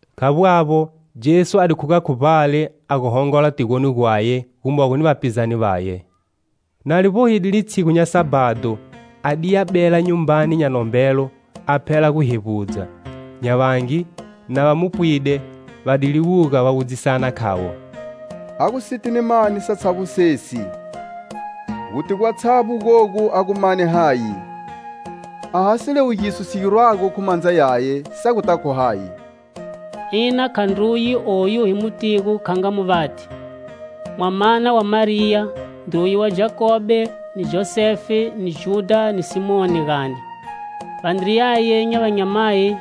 Khavbo avbo, Jesu a di khuga khu vbale a gu hongola tigoni gwaye gumogo ni vapizane vaye. Na li vbohide litshigu nya Sabhado, adiya bela nyumbani nya nombelo a phela gu hevbudza; nya vangi, na va mu pwide, va di liwuga, va wudzisana khavo: "A gu siti ni mani satshavbo sesi? Guti gwatshavbo gogu a gu mane hayi? A ha siliwugiso si girwago khu mandza yaye, sa guta khu hayi? Ina khandruye oyu hi mu tigo kha nga muvati, mwamana wa Mariya, ndruye wa Jakobe ni Josefe ni Judha ni Simoni, gani? Vandriyaye nya vanyamayi,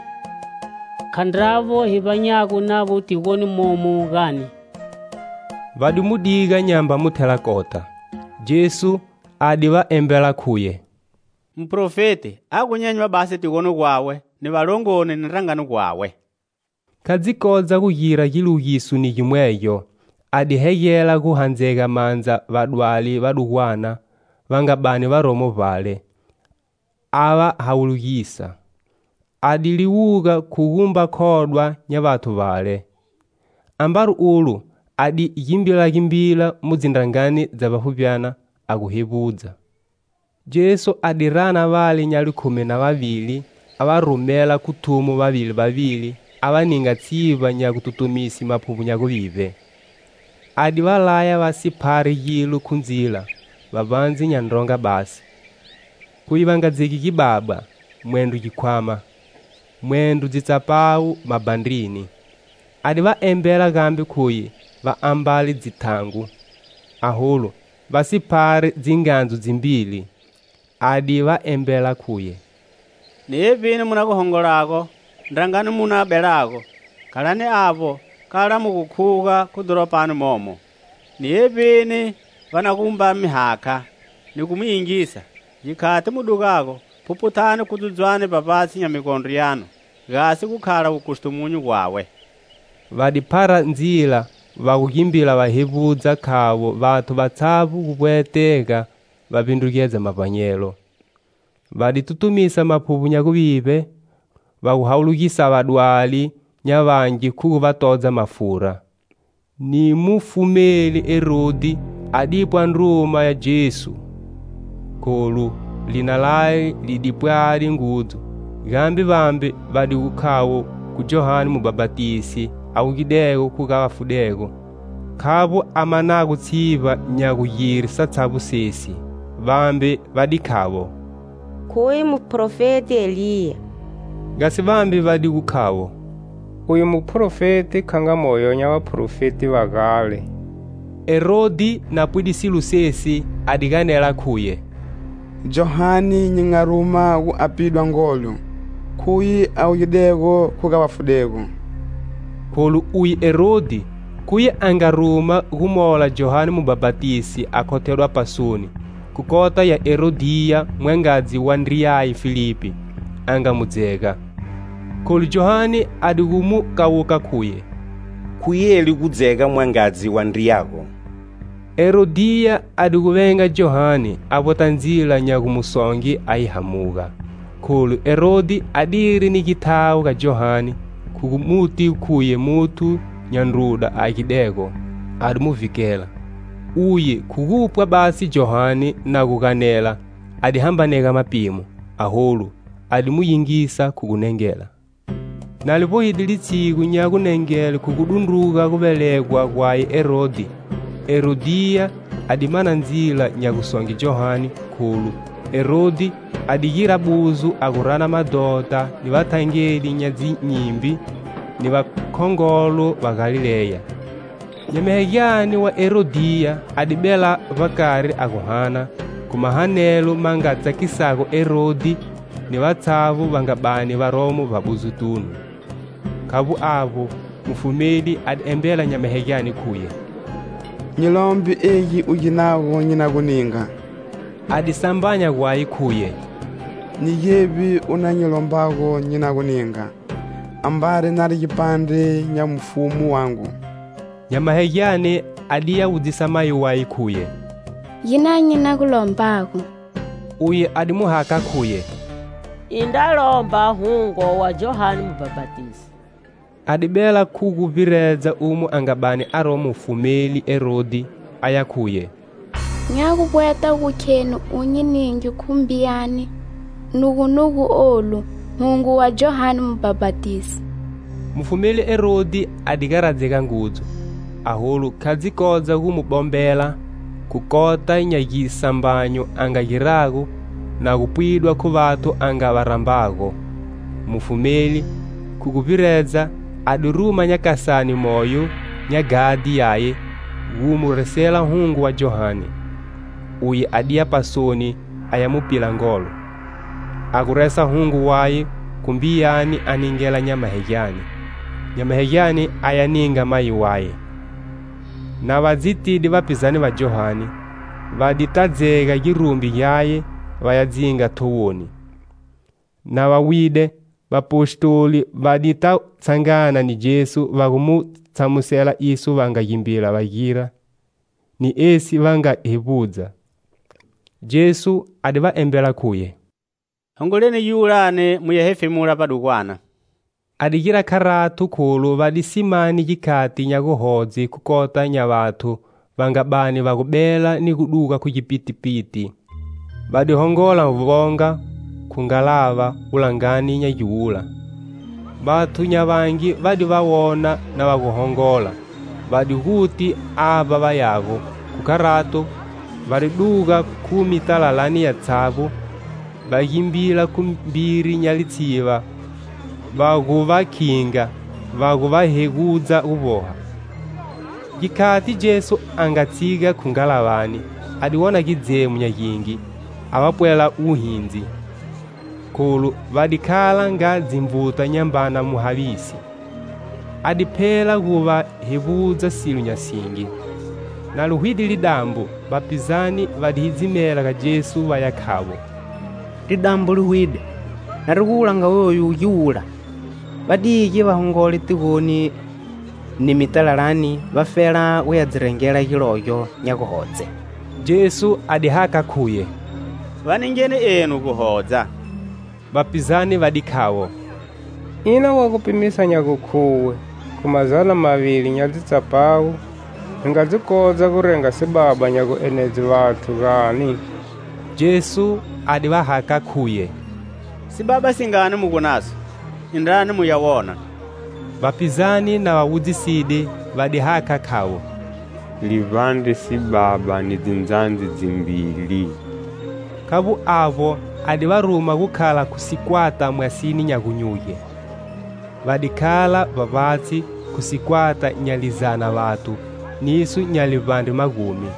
khandravo hi vbanyago navo tigoni momu, gani?" Va di mu diga nyamba mu thela kota. Jesu a di va embela khuye: "Muprofeti a gu nyenywa basi tigoni gwawe, ni valongoni ni ndrangani gwawe." Kha dzi kodza gu gira giliwugiso ni gimwegyo, a di hegela gu handzega mandza vadwali vadugwana va nga bani varomo bale, a va hawulugisa. A di liwuga khu gumba khodwa nya vathu vale. Ambari ulo a di gimbilagimbila mu dzindrangani dza vbafuvbi a gu hevbudza. Jesu a di rana vale nya likhumi na vavili, a va rumela khu thumo vavili vavili, a va ninga tshivba nya gututumise maphuvbo nya guvivbe. A di va laya va si phari gilo khu ndzila, vbavbandze nya ndronga basi; khuye va nga dzegi gibaba, mwendro gikhwama, mwendro dzitsapawu mabhandrini. A di va embela gambe khuye va ambale dzitangu, aholu va si phari dzingandzu dzimbili. A di va embela khuye: "Ni evbini mu na gu hongolago, ndrangani mu na gu belago, khalani avbo kala mu gu khuga khu dhoropani momo. Ni evbini va na gumba mi hakha ni gu mi yingisa, gikhati mu dugago, phuphuthani kudzudzwane vbavbatshi nya migondro yanu gasi gu khala wukustumunyu gwawe." Va di phara ndzila va gu gimbila va hevbudza khavo vathu vatshavbo gu vbwetega va vbindrugedza mavbanyelo. Va di tutumisa maphuvbo nya guvivbe, va gu hawulugisa vadwali nya vangi khu gu va todza mafura. Ni mufumeli Herodhi a dipwa ndruma ya Jesu. Kholu lina laye li di pwade ngudzu, gambe vambe va di gu khavo khu Johane Mubhapatisi a wugidego khu ga vafudego khavbo a manago tshivba nya gugire satshavbo sesi. Vambe va di khavo "Khuye muprofeti Eliya." Gasi vambe va di gu khavo: "Uye muprofeti kha nga moyo nya vaprofeti va gale." Herodhi, na pwide silo sesi, a di ganela khuye: "Johane nyi nga ruma gu a pidwa ngolo, khuye a wugidego khu ga vafudego." Kholu uye Herodhi, khuye a nga ruma gu mola Johane mubhapatisi a khothedwa pasoni, khu kota ya Herodhiya mwangadzi wa ndriyaye Filipi; a nga mu dzega. Kholu Johane a di gu mu kawuka khuye: "Khu yeli gu dzega mwangadzi wa ndriyago." Herodhiya a di gu venga Johane, a vbweta ndzila nya gu mu songe a yi hamuga. Kholu Herodhi adiri ni githawo ga Johane khu gu muti khuye muthu nya ndruda a agidego, a di mu vhikela. Uye, khu gupwa basi Johane na gu ganela a di hambanega mapimo, aholu, a di mu yingisa khu gunengela. Na li vbohide litshigu nya gunengele khu gu dundruga guvelegwa gwaye Herodhi, Herodhiya a di mana ndzila nya gusonge Johane, kholu Herodhi a di gira buzo a gu rana madhota, ni vathangeli nya dzinyimbi ni vakhongolo va Galileya. Nyamahegyane wa Herodhiya a di bela vbakari a gu hana, khu mahanelo ma nga tsakisago Herodhi ni vatshavbo va nga bani varomo vbabuzotunu. Khavbo avbo, mufumeli a di embela nyamahegyane khuye: "Nyi lombe egi u ginago nyi na gu ninga." A di sambanya gwaye, khuye: "Ni gevbi u na nyi lombago nyi na gu ninga, ambari nari gipandre nya mufumu wangu!" Nyamahegyane adiya wudzisa mayi waye khuye: "Ginani nyi na gu lombago?" Uye a di mu hakha khuye: "Indra lomba hungo wa Johane Mubhapatisi." A di bela khu gu vbiredza umo a nga bani aromo mufumeli Herodhi, a ya khuye: "Nya gu vbweta gu kheni u nyi ninge khu mbiyani, nugunugu olu, hungo wa Johane Mubhapatisi." Mufumeli Herodhi a di garadzega ngudzu; aholu kha dzi kodza gu mu bombela khu kota nya gisambanyo a nga girago na gu pwidwa khu vathu a nga va rambago. Mufumeli, khu gu vbiredza, a di ruma nyakasane moyo nya ghadhi yaye gu mu resela hungo wa Johane. Uye a diya pasoni a ya mu pila ngolo, a gu resa hungo waye khu mbiyani a ningela nyamahegyane, nyamahegyane aya ninga mayi waye. Na va dzi tide vapizane va Johane, va di ta dzega girumbi gyaye va ya dzinga thowoni. Na va wide, vapostoli va di ta tshangana ni Jesu va gu mu tshamusela iso va nga gimbila va gira ni esi va nga hevbudza. Jesu a di va embela khuye: "Hongoleni giwulani mu ya hefemula vbadugwana." A di gira kharato kholu va di si mani gikhati nya guhodze khu kota nya vathu va nga bani va gu bela ni gu duga khu gipitipiti. Va di hongola vonga khu ngalava wulangani nya giwula. Vathu nya vangi va di va wona na va gu hongola, va di guti avba va yago, khu kharato, va di duga khu mitalalani yatshavbo, va gimbila khu mbiri nya litsiva va gu va khinga, va gu va hegudza gu vboha. Gikhati Jesu a nga tshiga khu ngalavani, a di wona gidzemo nya gingi, a va pwela wuhindzi, kholu va di khala nga dzinvuta nyambana muhavisi. A di phela gu va hevbudza silo nya singi. Na li hwide lidambo, vapizane va di hidzimela ga Jesu va ya khavo: "Lidambo li hwide, na ri gu wulanga wowu giwula; va dige va hongole tigoni ni mitalalani vafela gu ya dzi rengela gilogyo nya gugodze." Jesu a di hakha khuye: "Va ningeni enu guhodza." Vapizane va di khavo: "Ina wa gu pimisa nya gukhuwe khu mazana mavili nya dzitsapawu hi nga dzi hodza gu renga sibaba nya guenedze vathu, gani?" Jesu a di va hakha khuye: "Sibaba singani mu gu naso? Indrani mu ya wona." Vapizane, na va wudziside va di hakha khavo: "Livbandre sibaba ni dzindzandzi dzimbili." Khavbo avbo, a di va ruma gu khala khu sikwata mwasini nya gunyuge. Va di khala vbavbatshi khu sikwata nya lizana vathu niso nya livbandre magumi.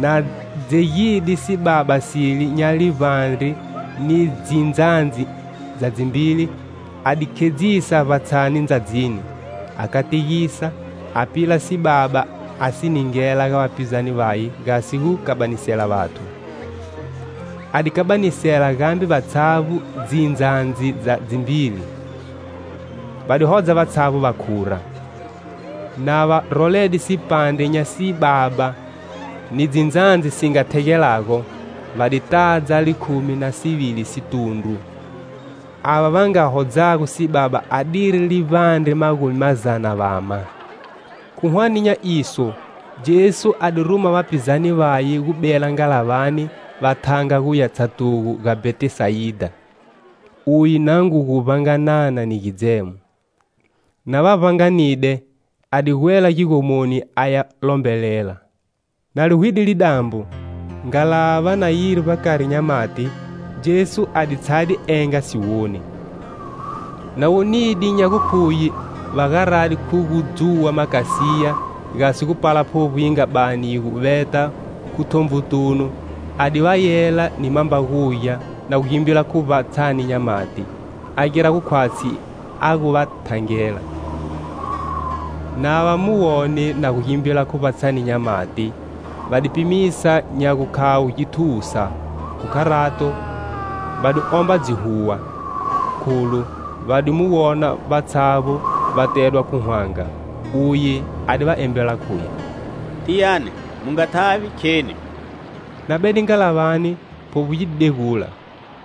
Na dzegide sibaba sile nya livbandre ni dzindzandzi dza dzimbili, a di khedzisa vbatshani ndzadzini, a kategisa, a pila sibaba a si ningela ga vapizane vaye gasi gu kabanisela vathu. A di kabanisela gambe vatshavbo dzindzandzi dza dzimbili. Va di hodza vatshavbo va khura. Na va rolede sipandre nya sibaba ni dzindzandzi si nga thegelago, va di tadza likhumi na sivili situndru. Ava va nga hodzago sibaba adiri livbandre magumi mazana vama. Khu hwane nya iso, Jesu a di ruma vapizane vaye gu bela ngalavani va thanga guya tshatugo ga Bhetisayida, uye na ngu gu vbanganana ni gidzemo. Na va vbanganide, a di gwela gigomoni aya lombelela. Na li hwide lidambo, ngalava na yiri vbakari nya mati, Jesu a di tshade enga siwoni. Na wonide nya gukhuye va garade khu gu dzuwa makasiya gasi gu pala phuvbo yi nga bani yi gu veta khu thonvutunu, a di va yela ni mambagugya na gu gimbila khu vbatshani nya mati, a gira gu khwatshi a gu va thangela. Na va mu wone na gu gimbila khu vbatshani nya mati, va di pimisa nya gukhavo githusa. Khu kharato, va di womba dzihuwa. Kholu va di mu wona vatshavbo va tedwa khu hwanga. Uye a di va embela khuye: "Tiyani, mu nga thavi! Kheni." Na bede ngalavani, phuvbo yi di degula.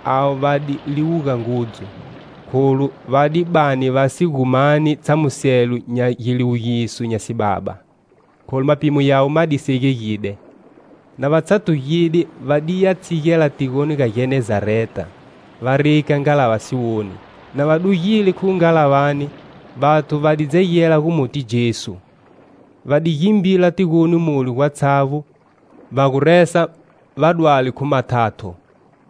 Avo va di liwuga ngudzu, kholu va di bani va si gu mani tshamuselo nya giliwugiso nya sibaba, kholu mapimo yawe ma di segegide. Na va tshatugide va di ya tshigela tigoni ga Genezareta, va rika ngalava siwoni. Na va dugile khu ngalavani, vathu va di dzegela gu muti Jesu. Va di gimbila tigoni mule gatshavbo, va gu resa vadwali khu mathatho,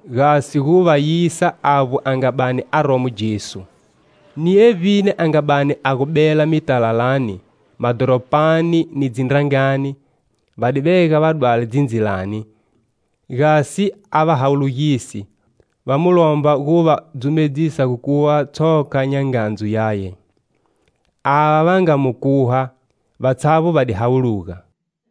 gasi gu va yisa avbo a nga bani aromo Jesu. Ni evbini a nga bani a gu bela, mitalalani, madhoropani ni dzindrangani, va di vega vadwali dzindzilani, gasi a va hawulugise, va mu lomba gu va dzumedzisa gu khuha tshoka nya ngandzu yaye. Ava va nga mu khuha, vatshavbo va di hawuluga.